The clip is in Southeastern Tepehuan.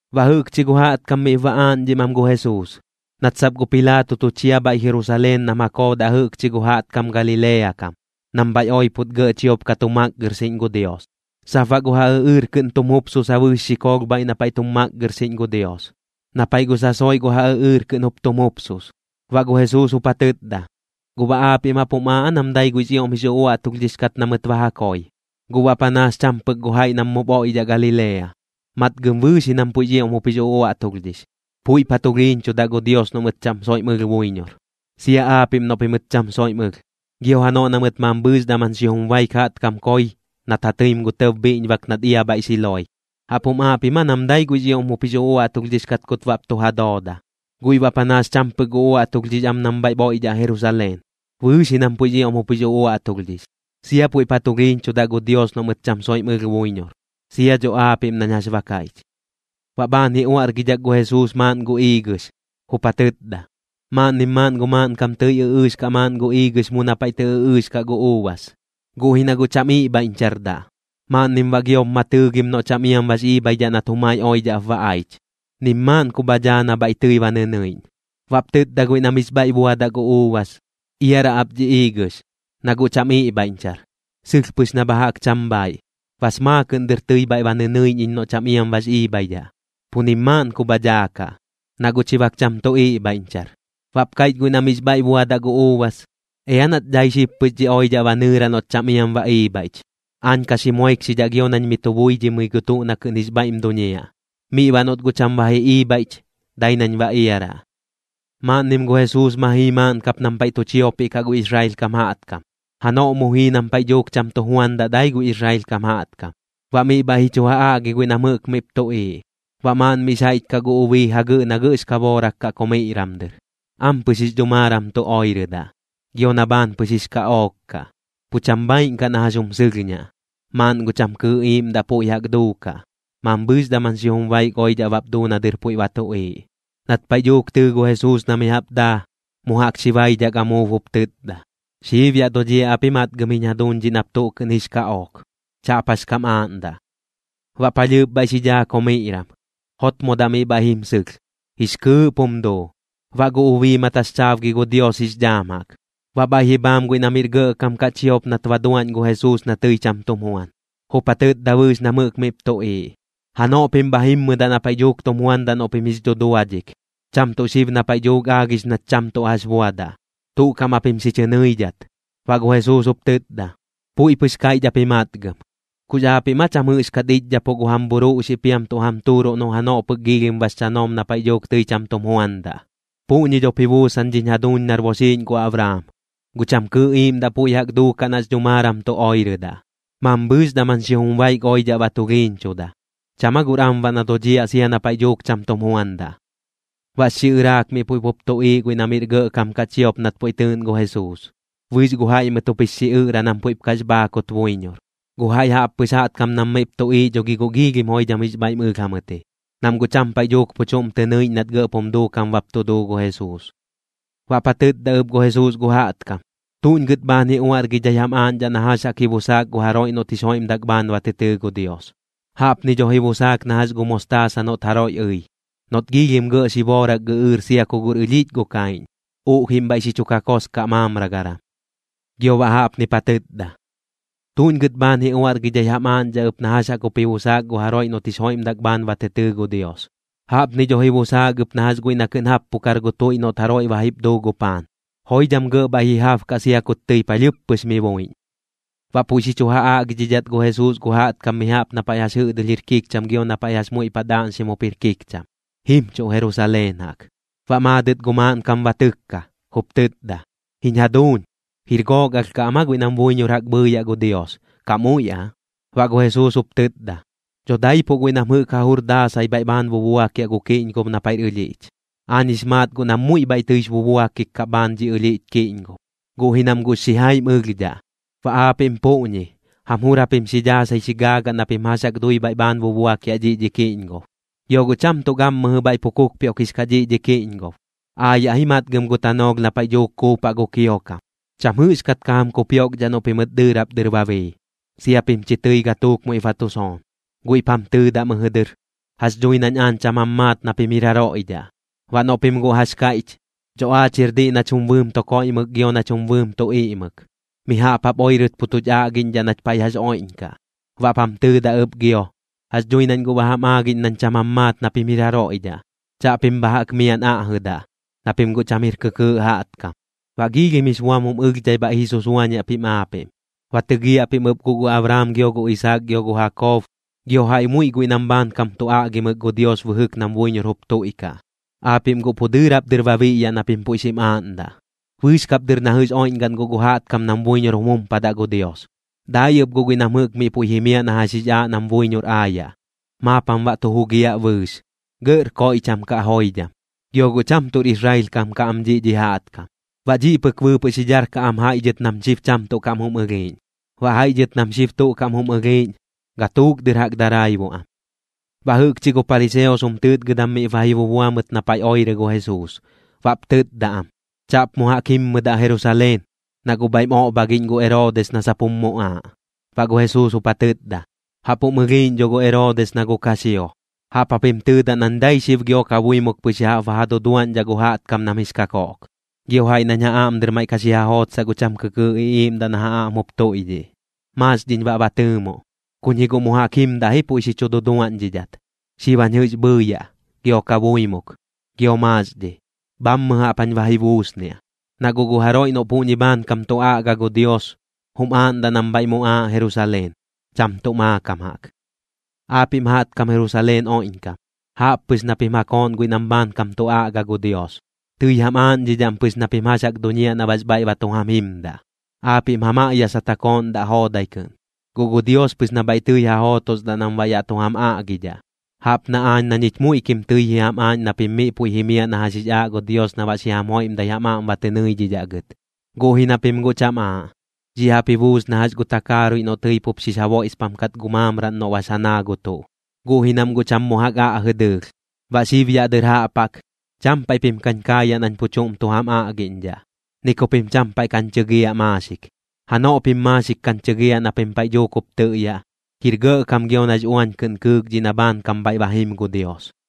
Baꞌ jɨꞌkchi gu jaꞌtkam miꞌp ba aaꞌñdhim am gu Jesuus, nat sap gu Pilaato tu chia bhaiꞌ Jerusaleen nam ja koodaꞌ jɨꞌkchi gu jaꞌtkam Galilea kam, nam bhaiꞌ oipot gɇꞌ chiop ka tu makgɨrxiꞌñ gu Dios. Sap baꞌ gu ja ɨꞌɨɨr kɨꞌn tum jupsusa bɨɨx xikoolh bhaiꞌ na paiꞌ tum makgɨrxiꞌñ gu Dios, na paiꞌ gu sasoiꞌ gu ja ɨꞌɨɨr kɨꞌn jup tum jupsus. Baꞌ gu Jesuus jup ja tɨtda: ―¿Guꞌ baꞌ aapiꞌm jaꞌp jum aaꞌ aa nam dai guiꞌx ioꞌm jix uꞌuaꞌtulhdhix kat na mɨt ba ja koi, guꞌ baꞌ panaas cham pɨk gu jaiꞌ nam puiꞌ mup oiꞌdhaꞌ Galilea? Matgɨm bɨɨx ji nam puiꞌx ioꞌm jup jix uꞌuaꞌtulhdhix, puiꞌp ja tulhiiñchudaꞌ gu Dios noꞌ mɨt cham soiꞌm ɨlh buiñor, sia aapiꞌm noꞌ pimɨt cham soiꞌm ɨlh. Gio janoꞌ na mɨt mambhɨɨx daman xijum baik gu jaꞌtkam koi, nat ja tɨim gu tɇb bhiꞌñbak nat ia bhaiꞌ Siloe, ¿jaꞌp jum aaꞌ pim aa nam dai guiꞌx ioꞌm jup jix uꞌuaꞌtulhdhix kat kut baꞌp tu ja dooda, guiꞌ baꞌ panaas cham pɨk uꞌuaꞌtulhdhix am nam bhaiꞌp oiꞌdhaꞌ Jerusaleen? Bɨɨx ji nam puiꞌx ioꞌm jup jix uꞌuaꞌtulhdhix, sia puiꞌp ja tulhiiñchudaꞌ gu Dios noꞌ mɨt cham soiꞌm ɨlh buiñor, sia dho aapiꞌm nañ jax ba kaiꞌch. Baꞌ bhaan ji uaꞌrgidhak gu Jesuus maaꞌn gu iigɨx, jup ja tɨtda: ―Maaꞌnnim maaꞌn gu maaꞌnkam tɨi ɨꞌɨɨx kaꞌ maaꞌn gu iigɨx mu na paiꞌ tɨ ɨꞌɨɨx kaꞌ gu uubas, guꞌ ji na guꞌ cham iꞌbhaiꞌñchardaꞌ. Maaꞌnnim baꞌ giop ma tɨɨgim noꞌ cham iam bax iibhaidhaꞌ nat jumai oidhaꞌp ba aich. Nim maaꞌn ku bha dhaa na bhaiꞌ tɨi ba nɨnɨiꞌñ. Baꞌp tɨtda guiꞌ na miꞌx bhaiꞌ buadaꞌ gu uubas: “Iaraꞌ ap dhi iigɨx, na guꞌ cham iꞌbhaiꞌñchar. Sɨlh pɨx na bha jaꞌk cham bhaiꞌ. Bas maakɨꞌn dɨr tɨi bhaiꞌ ba nɨnɨiꞌñ iñ noꞌ cham iam bax iibhaidhaꞌ, pu nim maaꞌn ku bha daakaꞌ, na guꞌ chi bak cham tu iꞌbhaiꞌñchar.” Baꞌp kaiꞌch guiꞌ na miꞌx bhaiꞌ buadaꞌ gu uubas: “Ea nach dai xib pɨx dhi oidhaꞌ ba nɨɨraꞌ noꞌt cham iam ba iibhaiꞌch. Aañ ka xi moikxidhaꞌ gio nañ mi tu buidhimɨi gu tuꞌ na kɨꞌn jix bhaiꞌm duñiaꞌ. Miꞌ baꞌ noꞌt guꞌ cham ba ji iibhaiꞌch, dai nañ ba iaraꞌ.” Maaꞌnnim gu Jesuus ma jii maaꞌn kap nam paiꞌ tu chiopiꞌ kaꞌ gu Israel kam jaꞌtkam, janoꞌ mu jii nam paiꞌ dhuuk cham tu juandaꞌ dai gu Israel kam jaꞌtkam. Baꞌ miꞌ bhaiꞌ ji chu ja aꞌgi guiꞌ nam jɨꞌk miꞌp tuꞌiiꞌ. Baꞌ maaꞌn miꞌx jaiꞌch kaꞌ gu ubii jagɨꞌ na gɇꞌx kaboorak kaꞌ komiꞌram dɨr. Ampɨx jix dhumaaram tu oirɨdaꞌ, gio na bhaan pɨx jix kaꞌook kaꞌ, pu cham bhaaiꞌn kaꞌ na jax jum sɨlhñaꞌ. Maaꞌn gu cham kɨɨꞌ iiꞌmdaꞌ puiꞌ jaꞌk duukaꞌ. Mambhɨɨx daman xijum baik oidhaꞌ bap duu na dɨr puiꞌ ba tuꞌiiꞌ. Nat paiꞌ dhuuk tɨɨ gu Jesuus na mi jaꞌp daa, mu jaꞌk xi baidhak amuub jup tɨtda: ―Xiib yaꞌ dodhiaꞌ ap ji matgɨm jiñ jaduuñ dhiꞌ nap tuꞌ kɨꞌn jix kaꞌook. Chaꞌp jax kam aaꞌndaꞌ. Baꞌ palhɨɨp bhaiꞌ xi dhaa komiꞌram. Jotmodaꞌ miꞌ bhaiꞌ jim sɨlh, jix kɨɨꞌp jum duu. Baꞌ gu ubii ma taxchaabgi gu Dios jix dhaam jaꞌk. Baꞌ bhaiꞌ ji bhaam guiꞌ na miꞌr gɇꞌkam kaꞌ chiop nat ba tu duaꞌñ gu Jesuus na tɨi cham tum juan. Jup ja tɨtda bɨɨx nam jɨꞌk miꞌp tuꞌiiꞌ: ―Janoꞌ pim bha jimmɨdaꞌ na paiꞌ dhuuk tum juandaꞌ noꞌ pim jix dhuduadhik, cham tuꞌ xib na paiꞌ dhuuk aagix nach cham tuꞌ jax buadaꞌ. Tuꞌ kaꞌm japim xi chɨ nɨiꞌñdhat. Baꞌ gu Jesuus jup tɨtda: ―Puiꞌ pɨx kaiꞌch ap ji matgɨm. ¿Kux aapiꞌm aa cham jɨꞌxkat iꞌchdhapuꞌ gu jam bhuruꞌxiꞌ piam tuꞌ jam tuuruꞌ noꞌ janoꞌ pɨk giilhim bax chanoom na paiꞌ dhuuk tɨi cham tum juandaꞌ? Puꞌñi dhop ji buusan dhiñ jaduuñ nar boxiiꞌñ gu Abraam, gu cham kɨɨꞌ iiꞌmdaꞌ puiꞌ jaꞌk duukaꞌ nax dhumaaram tu oirɨdaꞌ. Mambhɨɨx daman xijum baik oidhaꞌ ba tulhiiñchuda. ¿Cham aa guꞌr am baꞌ na dodhiaꞌ sia na paiꞌ dhuuk cham tum juandaꞌ? Baꞌx xiꞌɨraak miꞌ puiꞌ pup tuꞌiiꞌ guiꞌ na miꞌr gɇꞌkam kaꞌ chiop nat puiꞌ tɨɨꞌn gu Jesuus, bɨɨx gu jaiꞌ mɨt jup jix xiꞌɨꞌra nam puiꞌp kax bhaakut buiñor. Gu jaiꞌ jaꞌppɨx jaꞌtkam nam miꞌp tuꞌiiꞌ dho gi guꞌ giilhim joidham jix bhaiꞌm ɨlh jamɨt ji, nam guꞌ cham paiꞌ dhuuk pu chuꞌm tɨ nɨiꞌñ nat gɇꞌp jum duukam bap tu duu gu Jesuus. Baꞌp ja tɨtda ɨp gu Jesuus gu jaꞌtkam: ―¿Tuꞌñ gɨt bhaan ji uaꞌrgidhai jam aaꞌñdhaꞌ na jax jaꞌk ji busaak gu jaroiꞌ noꞌt jix joiꞌmdak bhaan ba tɨ tɨɨ gu Dios? Jaꞌpni dho ji busaak na jax gu mostaasa noꞌt jaroiꞌ ɨi, noꞌt giilhim gɇꞌ xiboorak gɨꞌɨɨr sia ku guꞌr ɨlhiꞌch gu kaiꞌñ, uꞌjiꞌm bhaiꞌ xi chu kakoskaꞌ maamragaram. Gio baꞌ jaꞌpnip ja tɨtda: ―¿Tuꞌñ gɨt bhaan ji uaꞌrgidhai jam aaꞌñdhaꞌ ɨp na jax jaꞌk jup ji busaak gu jaroiꞌ noꞌt jix joiꞌmdak bhaan ba tɨ tɨɨ gu Dios? Jaꞌpni dho ji busaak ɨp na jax guiꞌ na kɨꞌn jappukar gu tuiꞌ noꞌt jaroiꞌ ba jip duu gu paan, joidham gɇꞌ bhaiꞌ ji jabkaꞌ sia kut tɨi palhɨɨp pɨx mi buiꞌñ. Baꞌ puiꞌ xi chu ja aꞌgidhidhat gu Jesuus gu jaꞌtkam mi jaꞌp na paiꞌ jax jɨꞌdɨlh jir kikcham gio na paiꞌ jax muiꞌ paꞌ daaꞌñxim jup jir kikcham, jimchuꞌ Jerusaleen jaꞌk. Baꞌ maadɨt gu maaꞌnkam ba tɨkka, jup tɨtda: ―Jiñ jaduuñ, ¿jir gook alh kaꞌ am aa guiꞌ nam buiñor jaꞌk bhɨɨyaꞌ gu Dios, kaꞌ muiꞌ aa? Baꞌ gu Jesuus jup tɨtda: ―Dho daipuꞌ guiꞌ nam jɨꞌk ja jur daasai bhaiꞌ bhaan bubuakiaꞌ gu kiꞌñgob na paiꞌr ɨlhiꞌch. Aañ jix maat guꞌ nam muiꞌ bhaiꞌ tɨix bubuakik kaꞌ bhaan dhi ɨlhiꞌch kiꞌñgob, guꞌ ji nam guꞌx xijaim ɨlhdhaꞌ. Baꞌ aapiꞌm puꞌñi, jam jur japim xi dhaasai xi gaagaꞌ na pim jax jaꞌk dui bhaiꞌ bhaan bubuakiaꞌ dhiꞌ dhi kiꞌñgob. Gio guꞌ cham tuꞌ gammɨjɨ bhaiꞌ pu kupioꞌkix kaꞌ dhiꞌ dhi kiꞌñgob. Aayaꞌ ji matgɨm gu tanoolh na paiꞌ dhuuk kuupaꞌ gu kiokam. Cham jɨꞌxkat ka jam kupioꞌkdhaꞌ noꞌ pimɨt dɨɨrap dɨr ba bii, sia pim chi tɨi gatuuk muiꞌp ba tu soon. Guiꞌp jam tɨɨdaꞌ mɨjɨ dɨr: “Jax dhui nañ aañ cham jam maat na pim jir jaroiꞌ dhaꞌ.” Baꞌ noꞌ pim guꞌ jax kaiꞌch: “Dho aach jir diꞌ nach jum bɨɨm tu koiꞌmɨk gio nach jum bɨɨm tu iꞌmɨk, mi jaꞌp jap oirɨt pu tuch aꞌgiꞌñdhaꞌ nach paiꞌ jax oiꞌñkaꞌ.” Baꞌp jam tɨɨdaꞌ ɨp gio: “Jax dhui nañ guꞌ ba jam aagiꞌñ nañ cham jam maat na pim jir jaroiꞌ dhaꞌ. Chaꞌpim bha jaꞌk miaꞌn aꞌjɨdaꞌ, na pim guꞌ cham jir kɨkɨɨꞌ jaꞌtkam.” Baꞌ giilhim jix buam jum ɨlhdhai bhaiꞌ ji susuañiaꞌ pim aapiꞌm. Ba tɨgiaꞌ pim ɨp guꞌ gu Abraam, gio gu Isaak, gio gu Jakob, gio jaiꞌ muiꞌ guiꞌ nam bhaankam tu aꞌgimɨk gu Dios bɨjɨk nam buiñor jup tuiꞌkaꞌ, aapiꞌm guꞌ pu dɨɨrap dɨr ba biꞌyaꞌ na pim puiꞌ xim aaꞌndaꞌ. Bɨɨx kap dɨr na jɨꞌx oiꞌñgaꞌn guꞌ gu jaꞌtkam nam buiñor jum jumpadaꞌ gu Dios. Dai ɨp guiꞌ nam jɨꞌk miꞌ puiꞌ jimiaꞌ na jax jix aaꞌ nam buiñor aayaꞌ, maap jam baꞌ tu jugiaꞌ bɨɨx, gɇꞌr koiꞌcham kaꞌ joidham. Gio guꞌ cham tuꞌr Israel kam kaꞌ am dhiꞌ dhi jaꞌtkam. Baꞌ dhiꞌ pɨk bɨɨpɨꞌ xi dharkaꞌ am jaiꞌ dhɨt nam xib cham tuꞌ kam jum ɨlhiiꞌñ, baꞌ jaiꞌ dhɨt nam xib tuꞌ kam jum ɨlhiiꞌñ, gatuuk dɨr jaꞌk daraibuꞌ am. Baꞌ jɨꞌkchi gu pariseos jum tɨɨtgɨdam miꞌp ba ji bubua mɨt na paiꞌ oirɨ gu Jesuus. Baꞌp tɨtda am: ―Chaꞌp mu jaꞌk jimdaꞌ Jerusaleen, na guꞌ bhaiꞌm oꞌbhagiꞌñ gu Eroodis na sap jum muꞌaaꞌ. Baꞌ gu Jesuus jup ja tɨtda: ―Jaꞌp jum ɨlhiiꞌñ dho gu Eroodis na gu kaxio. Jaꞌp japim tɨɨdaꞌ nañ dai xib gio kabuimuk pɨx ya jaꞌp ba ja duduaꞌñdhaꞌ gu jaꞌtkam nam jix kakoꞌk, gio jaiꞌ nañ ja aꞌm dɨr maiꞌ ka xi ja jootsaꞌ gu cham kɨkɨɨꞌ iꞌiiꞌmdaꞌ na ja aꞌm jup tuiꞌdhiꞌ. Maaxdhiñ baꞌ ba tɨɨmoꞌ, kuñ ji guꞌ mu jaꞌk jimdaꞌ ji puiꞌ xi chu duduaꞌñdhidhat. Xib jañ jɨꞌx bhɨɨyaꞌ, gio kabuimuk, gio maaxdhi. Bhammɨ jaꞌp jañ ba ji buusniaꞌ, na guꞌ gu jaroiꞌ noꞌ puꞌñi bhaankam tu aꞌga gu Dios, jum aaꞌndaꞌ nam bhaiꞌ muꞌaaꞌ Jerusaleen, cham tuꞌ maakam jaꞌk. ’Aapiꞌm jaꞌtkam Jerusaleen oiꞌñkam, jaꞌp pɨx na pim ja kooꞌn guiꞌ nam bhaankam tu aꞌgadaꞌ gu Dios. Tɨi jam aaꞌñdhidhaꞌm pɨx na pim jax jaꞌk duñiaꞌ na baꞌx bhaiꞌ ba tu jam jimdaꞌ. Aapiꞌm ja maꞌyasat ja kooꞌndaꞌ joodai kɨꞌn, guꞌ gu Dios pɨx na bhaiꞌ tɨi ja jootosdaꞌ nam baꞌ yaꞌ tu jam aꞌgidhaꞌ. Jaꞌp na aañ na ñich muiꞌkim tɨi ji jam aaꞌñ na pim miꞌ puiꞌ jimiaꞌ na jax jix aaꞌ gu Dios na baꞌ xi jam joiꞌmdat jam aꞌm ba tɨ nɨidhidhaꞌ gɨt, guꞌ ji na pim guꞌ cham aaꞌ. Dhiꞌ jaꞌp ji buus na jax gu takaaruiꞌ noꞌ tɨi pup bɨɨx xix ja boiꞌspam kat gu maamraꞌn noꞌ bax ja naa gu tuꞌ, guꞌ ji nam guꞌ cham mu jaꞌk aꞌjɨdaꞌ dɨɨlh. Baꞌ xib yaꞌ dɨr jaꞌp jaꞌk, cham paiꞌ pim kañ kaayaꞌ nañ pu chuꞌm tu jam aꞌgiꞌñdhaꞌ, ni ku pim cham paiꞌ kañ chɨgiaꞌ maaxik. Janoꞌ pim maaxik kañ chɨgiaꞌ na pim paiꞌ dhuuk jup tɨꞌyaꞌ: “¡Jir gɇꞌkam gio nax uañ kɨꞌn kɨɨk dhiꞌ na bhaankam bhaiꞌ ba jim gu Dios!”